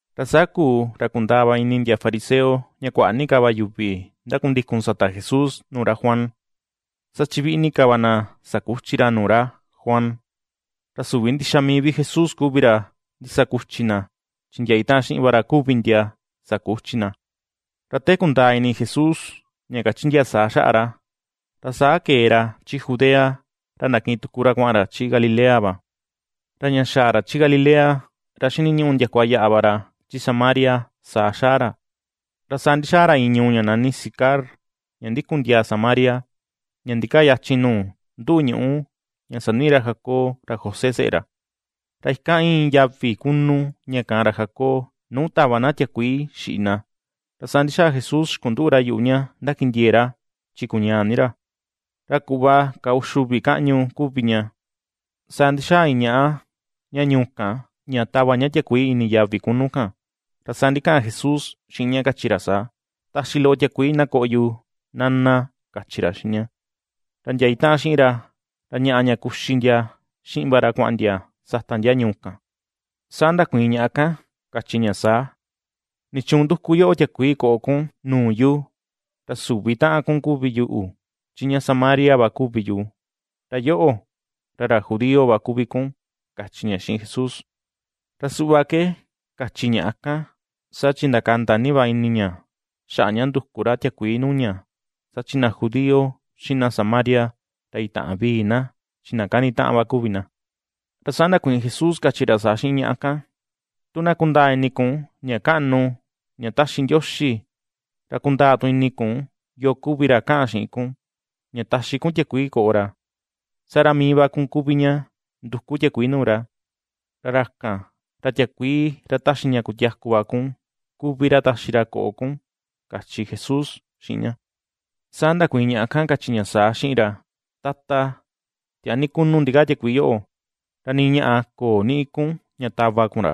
Ra saa kuu ra kundaa va ini ndia fariseo ña kuaꞌa ni ka yuvi ndakundikun sata Jesús nuu ra Juan, saa chi viꞌi ni ka va na sakuchi ra nuu ra Juan. Ra süvi ndixa mii vi Jesús kuvi ra ndisakuchi na, chi ndia itaꞌan xiꞌin va ra kuvi ndia sakuchi na. Ra te kundaa ini Jesús ña kachi ndia saa xaꞌa ra, ra saa kee ra chi Judea ra ndakiꞌin tuku ra kuaꞌan ra chi Galilea va. Ra ña xaa ra chi Galilea ra xiniñuꞌu ndiakua yaꞌa va ra chi Samaria saa xaa ra. Ra saa ndixaa ra iin ñuu ña nani Sicar ña ndikun ndiaa Samaria, ña ndikaa yachin nuu nduꞌu ñuꞌu ña saniꞌi ra Jacob ra José seꞌe ra. Ra ikan íin yavi kunu ña kaan ra Jacob nuu tava na tiakuii xiꞌi na. Ra saa ndixaa Jesús xikunduꞌu ra yuꞌu ña ndakindiee ra, chi kuñaa ni ra. Ra kuꞌva ka uxi uvi kaꞌñu kuvi ña. Saa ndixaa iin ñaꞌa ña ñuu kan ña tava ña tiakuii ini yavi kunu kan, ra saa ndikaꞌan Jesús xiꞌin ña kachi ra saa: ―Taxi loꞌo tiakuii na koꞌo yu, Nana ―kachi ra xiꞌin ña. Ra ndia itaꞌan xiꞌin ra, ra ñaꞌa ña kuxi ndia xiꞌin va ra kuaꞌan ndia sata ndia ñuu kan. Saa ndakuiin ñaꞌa kan kachi ña saa: ―¿Nichuun nduku yoꞌo tiakuii koꞌo kun nuu yu? Ra süvi taꞌan kun kuvi yuꞌu chi ña Samaria va kuvi yu, ra yoꞌo ra ra judío va kuvi kun ―kachi ña xiꞌin Jesús. Ra suꞌva ke kachi ñaꞌa kan saa chi ndakanda ni va ini ña xaꞌa ña nduku ra tiakuii nuu ña saa chi na judío, xiꞌin na Samaria, ra itäꞌan vii na chi na kanitaꞌan va kuvi na. Ra saa ndakuiin Jesús kachi ra saa xiꞌin ñaꞌa kan: ―Tu na kundaa ini kun ña kaꞌnu ña taxi Ndioxi, ra kundaa tu ini kun yoo kuvi ra kaꞌan xiꞌin kun ña taxi kun tiakuii koꞌo ra, saa ra mii va kun kuvi ña nduku tiakuii nuu ra, ra ra kan ra tiakuii ra taxi ña kutiaku va kun kuvi ra taxi ra koꞌo kun ―kachi Jesús xiꞌin ña. Saa ndakuiin ñaꞌa kan kachi ña saa xiꞌin ra: ―Tata, tiaa ni kunu ndikaa tiakuii yoꞌo, ra nii ñaꞌa köo niꞌi kun ña tava kun ra.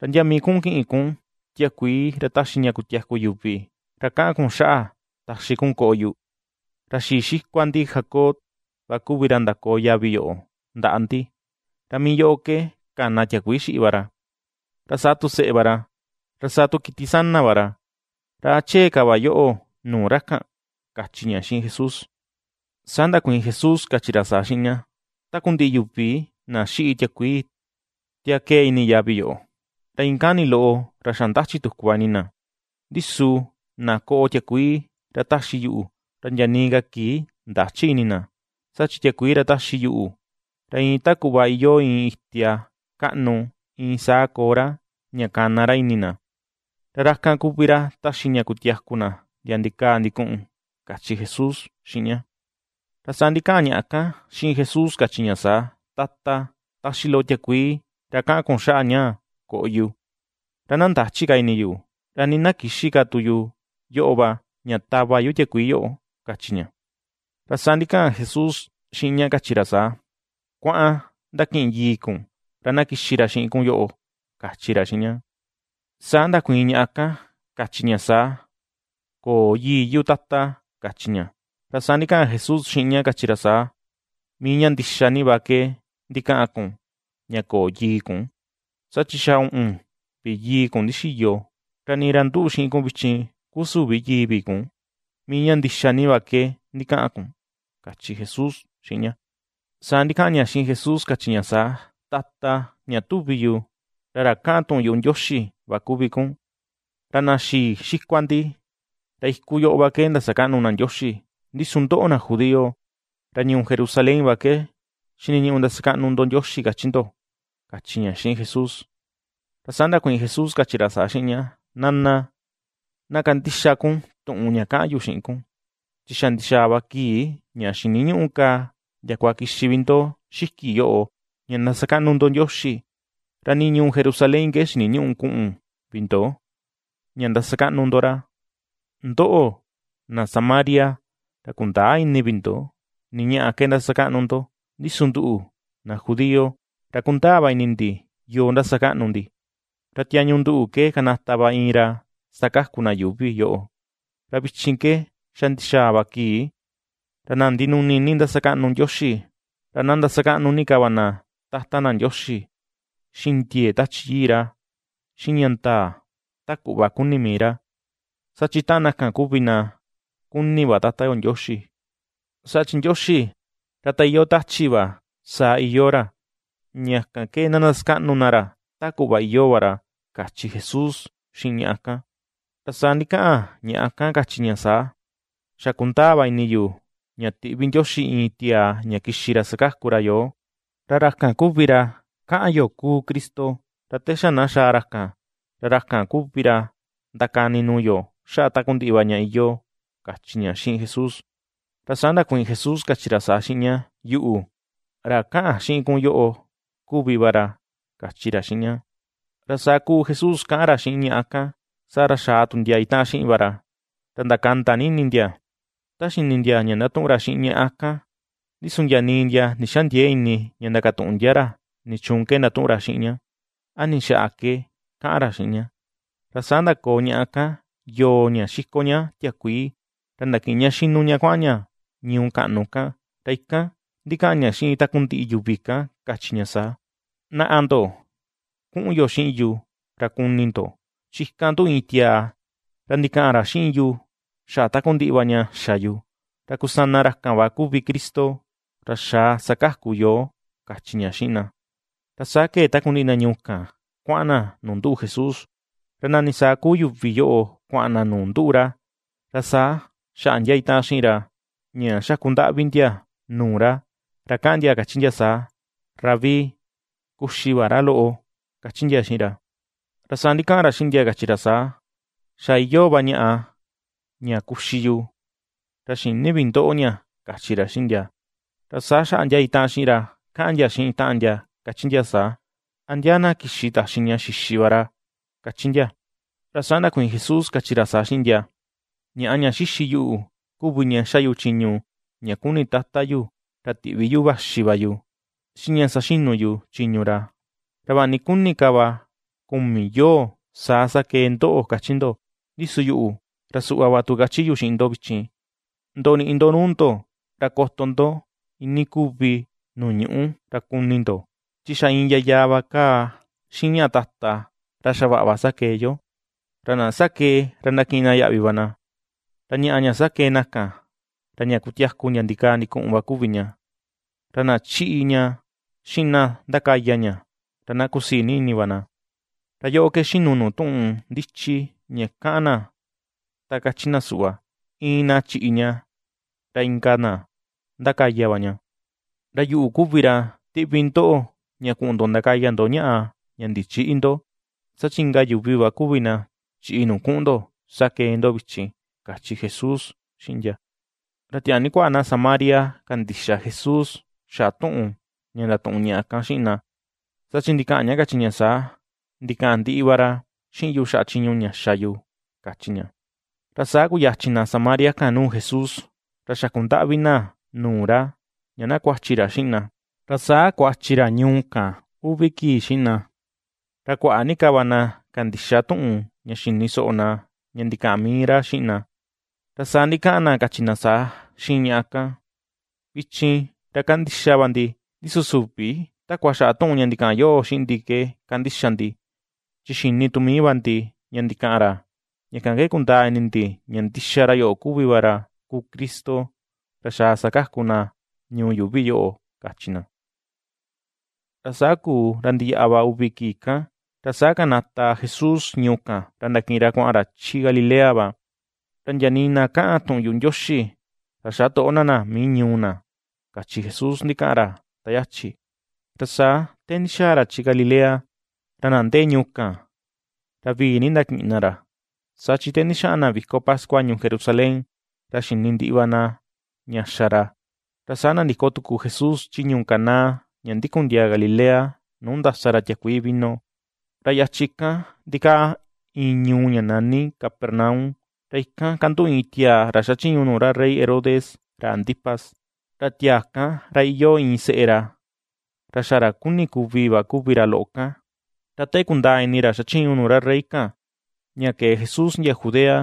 ¿Ra ndia mii kuꞌun kiꞌin kun tiakuii ra taxi ña kutiaku yuvi, ra kaꞌan kun xaꞌa taxi kun koꞌo yu? Ra xii xikua ndi Jacob va kuvi ra ndakoo yavi yoꞌo ndaꞌa ndi, ra mii yoꞌo ke kana tiakuii xiꞌi va ra, ra saa tu seꞌe va ra, ra saa tu kiti sana va ra. ¿Ra a chee ka va yoꞌo nuu ra kan? ―kachi ña xiꞌin Jesús. Saa ndakuiin Jesús kachi ra saa xiꞌin ña: ―Takundiꞌi yuvi na xiꞌi tiakuii tia kee ini yavi yoꞌo, ra iin kani loꞌo ra xa ndachi tuku va ini na. Ndi su na koꞌo tiakuii ra ^taxi yuꞌu, ra ndia nii ka kii ndächi ini na. Saa chi tiakuii ra taxi yuꞌu, ra iin ta kuꞌva iyoo iin itia kaꞌnu iin saa koo ra, ña kana ra ini na, ra ra kan kuvi ra taxi ña kutiaku na ndia ndikaa ndikuꞌun ―kachi Jesús xiꞌin ña. Ra saa ndikaꞌan ñaꞌa kan xiꞌin Jesús kachi ña saa: ―Tata, taxi loꞌo tiakuii ra kaꞌan kun xaꞌa ñaa koꞌo yu, ra na ndächi ka ini yu, ra nii na kïxi ka tu yu yoꞌo va ña tava yu tiakuii yoꞌo ―kachi ña. Ra saa ndikaꞌan Jesús xiꞌin ña kachi ra saa: ―Kuaꞌan ndakiꞌin yii kun ra na kixi ra xiꞌin kun yoꞌo ―kachi ra xiꞌin ña. Saa ndakuiin ñaꞌa kan kachi ña saa: ―Köo yii yu, Tata ―kachi ña. Ra saa ndikaꞌan Jesús xiꞌin ña kachi ra saa: ―¡Mii ña ndixa ni va ke ndikaꞌan kun ña köo yii kun! Saa chi xa uꞌun vi yii kun ndixiyo, ra nii ra nduꞌu xiꞌin kun vichin kuu süvi yii vi kun. ¡Mii ña ndixa ni va ke ndikaꞌan kun! ―kachi Jesús xiꞌin ña. Saa ndikaꞌan ña xiꞌin Jesús kachi ña saa: ―Tata, ña tuvi yu, ra ra kaꞌan tuꞌun yuꞌu Ndioxi va kuvi kun. Ra na xii xikua ndi, ra iku yoꞌo va ke ndasakaꞌnu na Ndioxi, ndi su ndoꞌo na judío, ra ñuu Jerusalén va ke xiniñuꞌu ndasakaꞌnu ndo Ndioxi kachi ndo ―kachi ña xiꞌin Jesús. Ra saa ndakuiin Jesús kachi ra saa xiꞌin ña: ―Nana, na kandixa kun tuꞌun ña kaꞌan yu xiꞌin kun, chi xa ndixaa va kii ña xiniñüꞌu ka ndiakua kixi vi ndo xiki yoꞌo ña ndasakaꞌnu ndo Ndioxi, ra nii ñuu Jerusalén ke xiniñüꞌu kuꞌun vi ndo, ña ndasakaꞌnu ndo ra. Ndoꞌo, na Samaria, ra kundäa ini vi ndo ni ñaꞌa ke ndasakaꞌnu ndo, ndi su nduꞌu, na judío, ra kundaa va ini ndi yoo ndasakaꞌnu ndi. Ra tiañu nduꞌu ke kanata va iin ra sakaku na yuuvi yoꞌo. Ra vichin ke xa ndixaa va kii, ra na ndinuni ni ini ndasakaꞌnu Ndioxi, ra na ndasakaꞌnu ni ka va na Tata na Ndioxi xiꞌin ndiee Tachi Yii ra xiꞌin ña ndaa ta kuꞌva kuni mii ra, saa chi taꞌan na kan kuvi na kuni va Tata yo Ndioxi. Saa chi Ndioxi ra ta iyoo tachi va saa iyoo ra, ña kan ke na ndasakaꞌnu na ra ta kuꞌva iyoo va ra ―kachi Jesús xiꞌin ñaꞌa kan. Ra saa ndikaꞌan ñaꞌa kan kachi ña saa: ―Xa kundaa va ini yu ña tiꞌvi Ndioxi iin tiaa ña kixi ra sakaku ra yoo, ra ra kan kuvi ra kaꞌan yo kuu Cristo. Ra te na xaa ra kan, ra ra kan kuvi ra ndakani nuu yo xaꞌa takundiꞌi va ña iyoo ―kachi ña xiꞌin Jesús. Ra saa ndakuiin Jesús kachi ra saa xiꞌin ña: ―Yuꞌu, ra kaꞌan xiꞌin kun yoꞌo kuvi va ra ―kachi ra xiꞌin ña. Ra saa kuu Jesús kaꞌan ra xiꞌin ñaꞌa kan, saa ra xaa tu ndia itaꞌan xiꞌin va ra, ra ndakanda ni ini ndia ta xini ndia ña ndatuꞌun ra xiꞌin ñaꞌa kan. Ndi su ndia nii ndia ndixändiee ini ña ndakatuꞌun ndia ra nichuun ke ndatuꞌun ra xiꞌin ña, a ni xaꞌa ke kaꞌan ra xiꞌin ña. Ra saa ndakoo ñaꞌa kan yoo ña xiko ña tiakuii, ra ndakiꞌin ña xinu ña kuaꞌan ña ñuu kaꞌnu kan, ra ikan ndikaꞌan ña xiꞌin takundiꞌi yuvi kan kachi ña saa: ―Naꞌa ndo, kuꞌun yo xiꞌin yu ra kuni ndo, chi ikan nduꞌu iin tiaa ra ndikaꞌan ra xiꞌin yu xaꞌa takundiꞌi va ña xa yu. Ra kusana ra kan va kuvi Cristo, ra xaa sakaku yoo ―kachi ña xiꞌin na. Ra saa kee takundiꞌi na ñuu kan kuaꞌan na nu nduꞌu Jesús. Ra nani saa kuu yuvi yoꞌo kuaꞌan na nuu nduꞌu ra, ra saa xaꞌa ndia itaꞌan xiꞌin ra ña xakundaꞌvi ndia nuu ra, ra kaꞌan ndia kachi ndia saa: ―Rabí, kuxi va ra loꞌo ―kachi ndia xiꞌin ra. Ra saa ndikaꞌan ra xiꞌin ndia kachi ra saa: ―Xa iyoo va ñaꞌa ña kuxi yu, ra xïni vi ndoꞌo ña ―kachi ra xiꞌin ndia. Ra saa xaꞌa ndia itaꞌan xiꞌin ra kaꞌan ndia xiꞌin taꞌan ndia kachi ndia saa: ―¿A ndia na kixi taxi ña xixi va ra? ―kachi ndia. Ra saa ndakuiin Jesús kachi ra saa xiꞌin ndia: ―Ñaꞌa ña xixi yu kuvi ña xa yu chiñu ña kuni Tata yu ra tiꞌvi yuꞌu vaxi va yu, xiꞌin ña saxinu yu chiñu ra. “Ra vaꞌa ni kuni ka va kumi yoo saa sakee ndoꞌo”, kachi ndo; ndi su yuꞌu, ra suꞌva va tu kachi yu xiꞌin ndo vichin, ndoniꞌi ndo nuu ndo ra koto ndo iinii kuvi nuu ñuꞌu ra kuni ndo, chi xa iin yayaa va kaa xiꞌin ñaꞌa tata, ra xavaꞌa va sakee yo. Ra na sakee ra ndakiꞌin na yaꞌvi va na, ra ñaꞌa ña sakee na kan, ra ña kutiaku ndia ndikaa ndikuꞌun va kuvi ña, ra na ^chiꞌi ña xiꞌin na ndakaya ña ra na kusii ni ini va na. Ra yoꞌo ke xinu nuu tuꞌun ndichi ña kaꞌan na ta kachi na suꞌva: “Iin na chiꞌi ña ra inka tu na ^ndakaya va ña”. Ra yuꞌu kuvi ra ^tiꞌvi ndoꞌo ña kuꞌun ndo ndakaya ndo ñaꞌa ña ndichïꞌi ndo, saa chi inka yuvi va kuvi na chiꞌi nuu kuꞌun ndo sakee ndo vichin ―kachi Jesús xiꞌin ndia. Ra tiaa ni kuaꞌa na Samaria kandixa Jesús xaꞌa tuꞌun ña ndatuꞌun ñaꞌa kan xiꞌin na, saa chi ndikaꞌan ña kachi ña saa: “Ndikaꞌan ndiꞌi va ra xiꞌin yu xaꞌa chiñu ña xa yu”, kachi ña. Ra saa kuyachin na Samaria kan nuu Jesús, ra xakundaꞌvi na nuu ra ña na kuachi ra xiꞌin na, ra saa kuachi ra ñuu kan uvi kii xiꞌin na. Ra kuaꞌa ni ka va na kandixa tuꞌun ña xini soꞌo na ña ndikaꞌan mii ra xiꞌin na. Ra saa ndikaꞌan na kachi na saa xiꞌin ñaꞌa kan: ―Vichin ra kandixa va ndi, ndi su süvi takua xaꞌa tuꞌun ña ndikaꞌan yoꞌo xiꞌin ndi ke kandixa ndi, chi xini tu mii va ndi ña ndikaꞌan ra ña kan ke kundaa ini ndi ña ndixa ra yoꞌo kuvi va ra kuu Cristo, ra xaa sakaku na ñuu yuuvi yoꞌo ―kachi na. Ra saa kuu ra ndiyaꞌa va uvi kii kan, ra saa kanata Jesús ñuu kan ra ndakiꞌin ra kuaꞌan ra chi Galilea va. Ra “Ndia nii na kaꞌan tuꞌun yuꞌu Ndioxi ra xätoꞌo na na mii ñuu na” kachi Jesús ndikaꞌan ra ta yachi. Ra saa te ndixaa ra chi Galilea, ra na ndee ñuu kan ra vii ni ndakiꞌin na ra, saa chi te ndixaꞌan na viko pascua ñuu Jerusalén ra xini ndiꞌi va na ña xa ra. Ra saa nandiko tuku Jesús chi ñuu Caná ña ndikun ndiaa Galilea nuu ndasa ra tiakuii vino. Ra yachin kan ndikaa iin ñuu ña nani Capernaum, ra ikan kanduꞌu iin tiaa ra xachiñu nuu ra rey Herodes ra Antipas, ra tiaa kan ra iyoo iin seꞌe ra, ra xa ra kuni kuvi va kuvi ra loꞌo kan. Ra te kundaa ini ra xachiñu nuu ra rey kan ña kee Jesús ndia Judea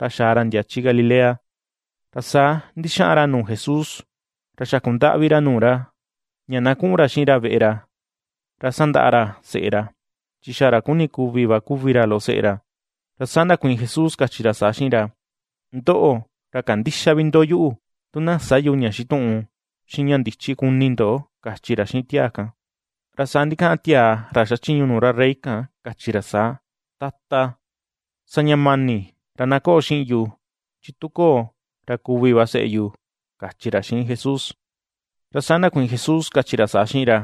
ra xaa ra ndia chi Galilea, ra saa ndixaꞌan ra nuu Jesús ra xakundaꞌvi ra nuu ra, ña na kuꞌun ra xiꞌin ra veꞌe ra, ra sandaꞌa ra seꞌe ra, chi xa ra kuni kuvi va kuvi ra loꞌo seꞌe ra. Ra saa ndakuiin Jesús kachi ra saa xiꞌin ra: ―Ndoꞌo, ra kandïxa vi ndo yuꞌu tu na sä yu ña xituꞌun xiꞌin ña ndichi kuni ndo ―kachi ra xiꞌin tiaa kan. Ra saa ndikaꞌan tiaa ra xachiñu nuu ra rey kan kachi ra saa: ―Tata, sa ña mani ra na koꞌo xiꞌin yu chi tu köo, ra kuvi va seꞌe yu ―kachi ra xiꞌin Jesús. Ra saa ndakuiin Jesús kachi ra saa xiꞌin ra: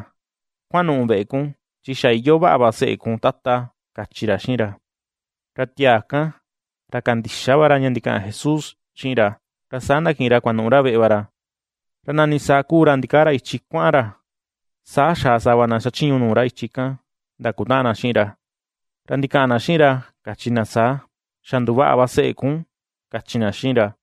―Kuanuꞌu veꞌe kun, chi xa iyoo vaꞌa va seꞌe kun, Tata ―kachi ra xiꞌin ra. Ra tiaa kan ra kandixa va ra ña ndikaꞌan Jesús xiꞌin ra, ra saa ndakiꞌin ra kuanuꞌu ra veꞌe va ra. Ra nani saa kuu ra ndikaa ra ichi kuaꞌan ra, saa xaa sava na xachiñu nuu ra ichi kan ndakutaꞌan na xiꞌin ra, ra ndikaꞌan na xiꞌin ra kachi na saa: ―Xa nduvaꞌa va seꞌe kun ―kachi na xiꞌin ra.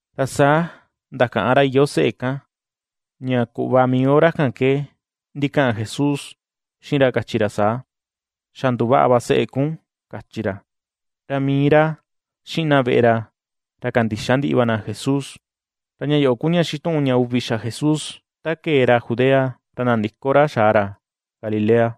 Ra saa ndakaꞌan ra iyoo seꞌe kan ña kuꞌva mii hora kan ke ndikaꞌan Jesús xiꞌin ra kachi ra saa: “Xa nduvaꞌa va seꞌe kun”, kachi ra. Ra mii ra xiꞌin na veꞌe ra ra kandixa ndiꞌi va na Jesús. Ra ña yoꞌo ku ña xituꞌun ña uvi xa Jesús, te kee ra Judea ra nandiko ra xaa ra Galilea.